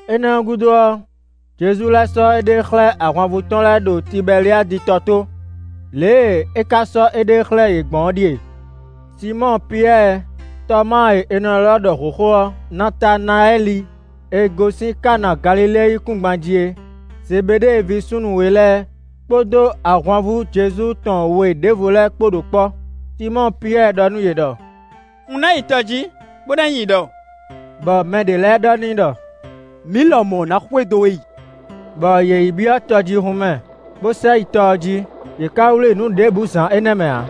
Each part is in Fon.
Énɛ́ ɔ́ gúdo ɔ́, Jezu lɛ́ sɔ́ éɖée xlɛ́ ahwanvú tɔn lɛ́ɛ ɖo Tibɛliadi tɔ tó. Lě e é ka sɔ́ éɖée xlɛ́ yě gbɔn é ɖíe: Sinmɔ́ɔ Piyɛ́ɛ, Tɔmáa e è nɔ ylɔ́ ɖɔ hǒxo ɔ́, Natanayɛ́li e gosín Kana Galilée yíkúngban jí é, Zebeɖée ví súnnu we lɛ́ɛ, kpódó ahwanvú Jezu tɔn we ɖěvo lɛ́ɛ kpó ɖo kpɔ́. Sinmɔ́ɔ Piyɛ́ɛ ɖɔ nú yě ɖɔ: “Un ná yi tɔ jǐ, bó ná yi nyi ɖɔ;” bɔ mɛ ɖě lɛ́ɛ ɖɔ n'i ɖɔ: “Mǐ lɔmɔ̌ ná xwedó we yi.” Bɔ yě yi byɔ́ tɔjíhún mɛ, bó sɛ yi tɔ ɔ́ jí; yě ká wlí nǔ ɖěbǔ zǎn énɛ́ mɛ ǎ.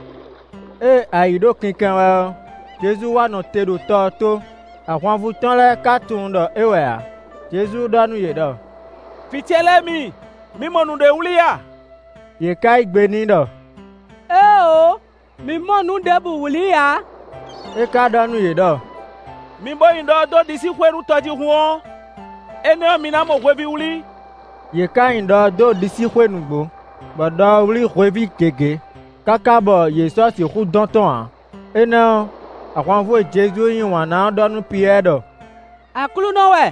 Ée ayǐ ɖo kinkɛn wɛ ɔ́, Jezu wá nɔ te ɖo tɔ ɔ́ tó, ahwanvú tɔn lɛ́ɛ ka tunwun ɖɔ é wɛ ǎ. Jezu ɖɔ nú yě ɖɔ: “Vǐ ce lɛ́ɛ mi; mi mɔ nǔɖé wlí a?” Yě ká yí gbe n'i ɖɔ: “Éeǒ! Mǐ mɔ nǔ ɖěbǔ wlí ǎ.” É ka ɖɔ nú yě ɖɔ: “Mi bo nyi ɖɔ ɔ́ dó ɖisíxwé nú tɔjíhún ɔ́, énɛ́ ɔ́ mi ná mɔ hweví wlí.” Yě ká nyi ɖɔ ɔ́ dó ɖisíxwé nǔgbó, bɔ ɖɔ ɔ́ wlí hweví gěgé, káká bɔ yě sɔ́ sixú dɔn tɔ́n ǎ. Énɛ́ ɔ́, ahwanvú e Jezu yí wǎn ná ɔ́ ɖɔ nú Piyɛ́ɛ ɖɔ: “Aklúnɔ wɛ!”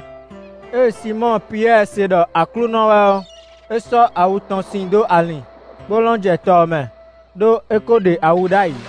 Ée Sinmɔ́ɔ Piyɛ́ɛ se ɖɔ Aklúnɔ wɛ ɔ́, é sɔ́ awu tɔn sin dó alin, bó lɔ́n jɛ tɔ ɔ́ mɛ, ɖó é ko ɖe awu ɖ'ayǐ.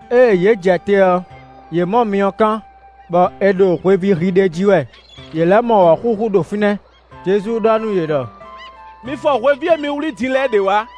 Ée yě jɛ te ɔ́, yě mɔ myɔkán, bɔ è ɖo hweví hi ɖ'é jí wɛ; yě lɛ́ mɔ wɔ̌xúxú ɖo fínɛ́. Jezu ɖɔ nú yě ɖɔ: “Mi fɔ hweví e mi wlí din lɛ́ɛ ɖě wǎ.”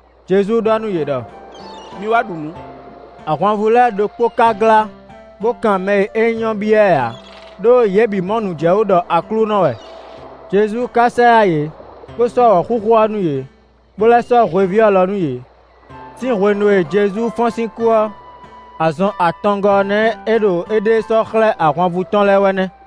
Jezu ɖɔ nú yě ɖɔ: “Mi wá ɖu nǔ.” Ahwanvú lɛ́ɛ ɖokpó ka glá, bó kan mɛ e é nyí ɔ́ byɔ́ ɛ ǎ ɖó yě bǐ mɔ nǔ jɛ wú ɖɔ Aklúnɔ wɛ. Jezu ka sɛ yá yě, bó sɔ́ wɔ̌xúxú ɔ́ nú yě, bó lɛ́ sɔ́ hweví ɔ́ lɔ nú yě. Sín hwenu e Jezu fɔ́n sín kú ɔ́, azɔn atɔngɔ́ ɔ́ nɛ́ é ɖo éɖée sɔ́ xlɛ́ ahwanvú tɔn lɛ́ɛ wɛ nɛ́.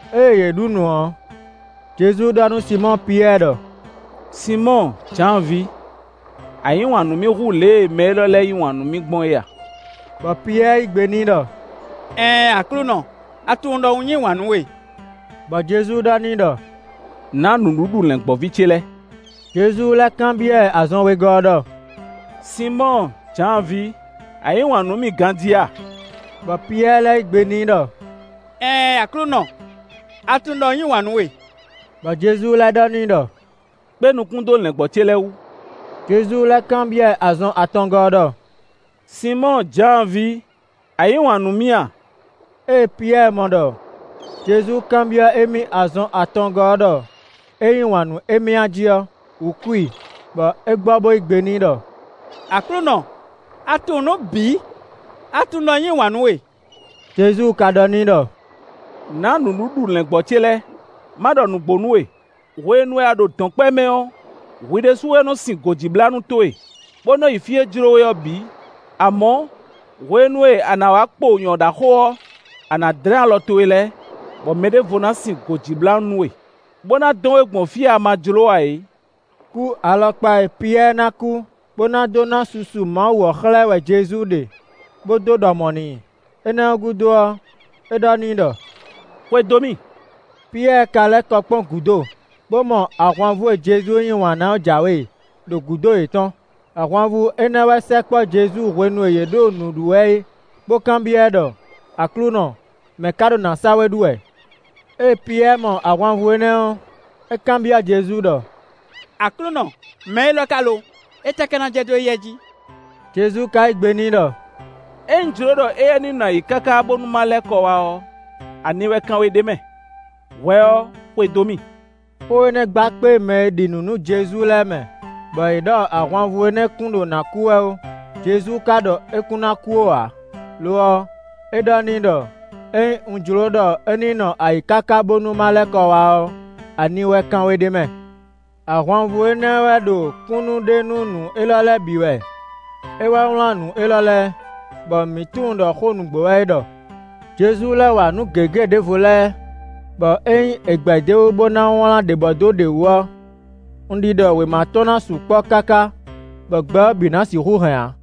Ée yě ɖu nǔ ɔ́, Jezu ɖɔ nú Sinmɔ́ɔ Piyɛ́ɛ ɖɔ: “Sinmɔ́ɔ Jǎan ví! A yǐ wǎn nú mì hú lě e mɛ élɔ́ lɛ́ɛ yí wǎn nú mì gbɔn é a?” Bɔ Piyɛ́ɛ yí gbe n'i ɖɔ: “Ɛɛn Aklúnɔ; a tunwun ɖɔ un yí wǎn nú we.” Bɔ Jezu ɖɔ n'i ɖɔ: “Nǎ nǔɖuɖu lɛ̌ngbɔ́ví ce lɛ́ɛ!” Jezu lɛ́ kanbyɔ́ ɛ azɔn wegɔ́ ɔ́ ɖɔ: “Sinmɔ́ɔ Jǎan ví, a yǐ wǎn nú mì ganjí a?” Bɔ Piyɛ́ɛ lɛ́ yí gbe n'i ɖɔ: “Ɛɛn Aklúnɔ, a tunwun ɖɔ un yí wǎn nú we.” Bɔ Jezu lɛ́ ɖɔ n'i ɖɔ: “Kpé nukún dó lɛ̌ngbɔ́ ce lɛ́ɛ wú.” Jezu lɛ́ kanbyɔ́ ɛ azɔn atɔngɔ́ ɔ́ ɖɔ: “Sinmɔ́ɔ Jǎan ví, a yǐ wǎn nú mì a?” Ée Piyɛ́ɛ mɔ ɖɔ Jezu kanbyɔ́ émí azɔn atɔngɔ́ ɔ́ ɖɔ é yí wǎn nú émí a jí ɔ́, wǔ kú i, bɔ é gbɔ bó yí gbe n'i ɖɔ: “Aklúnɔ, a tunwun nǔ bǐ; a tunwun ɖɔ un yí wǎn nú we.” Jezu ka ɖɔ n'i ɖɔ: “Nǎ nǔɖuɖu lɛ̌ngbɔ́ ce lɛ́ɛ. Má ɖɔ nǔgbó nú we, hwenu e a ɖo dɔ̌nkpɛ mɛ ɔ́, hwi ɖésú wɛ nɔ sin gǒjíblánú towe, bó nɔ́ yi fí e jló we ɔ́ bǐ; amɔ̌, hwenu e a nǎ wá kpo nyɔ̌ɖaxó ɔ́, a nǎ dlɛ́n alɔ towe lɛ́ɛ, bɔ mɛ ɖěvo ná sin gǒjíblánú nú we, bó ná dɔn we gbɔn fí e a ma jló ǎ é.” Kú alɔkpa e Piyɛ́ɛ ná kú, bó ná dó ná susu Mawu ɔ́ xlɛ́ ɛ wɛ Jezu ɖe, bó dó ɖɔ mɔ̌ n'i; énɛ́ ɔ́ gúdo ɔ́, é ɖɔ n'i ɖɔ: “Xwedó mì.” Piyɛ́ɛ ka lɛ́ kɔ kpɔ́n gúdo, bó mɔ ahwanvú e Jezu yí wǎn ná ɔ́ jǎwe ɖo gǔdo yětɔn; ahwanvú énɛ́ wɛ sɛkpɔ́ Jezu hwenu e yě ɖo nǔ ɖu wɛ é, bó kanbyɔ́ ɛ ɖɔ: “Aklúnɔ, mɛ̌ ka ɖo nǎ sa we ɖu wɛ.” Ée Piyɛ́ɛ mɔ ahwanvú énɛ́ ɔ́, é kanbyɔ́ Jezu ɖɔ: “Aklúnɔ, mɛ élɔ́ ka lo? Étɛ́ ka ná jɛ dó éyɛ́ jí?” Jezu ka yí gbe n'i ɖɔ: “Ényí un jló ɖɔ éyɛ́ ní nɔ ayǐ káká bónú ma lɛ́ kɔ wá ɔ́, ani wɛ kan we ɖ'é mɛ? Hwɛ ɔ́, xwedó mì.” Xó énɛ́ gba kpé mɛ e ɖi nǔ nú Jezu lɛ́ɛ mɛ, bɔ yě ɖɔ ahwanvú énɛ́ kun ɖo nǎ kú wɛ ó; Jezu ka ɖɔ é kún ná kú ó ǎ; lo ɔ́, é ɖɔ n'i ɖɔ: “Ényí un jló ɖɔ é ní nɔ ayǐ káká bónú ma lɛ́ kɔ wá ɔ́, ani wɛ kan we ɖ'é mɛ?” Ahwanvú énɛ́ wɛ ɖo kúnnu ɖe nú nǔ élɔ́ lɛ́ɛ bǐ wɛ; é wɛ wlán nǔ élɔ́ lɛ́ɛ, bɔ mǐ tunwun ɖɔ xó nǔgbó wɛ é ɖɔ. Jezu lɛ́ wa nǔ gěgé ɖěvo lɛ́ɛ, bɔ ényí è gbɛ̌ d'é wú bó ná wlán ɖě bɔdó ɖě wú ɔ́, un ɖiɖɔ wěma tɔn ná sukpɔ́ káká bɔ gbɛ ɔ́ bǐ ná sixú hɛn ǎ.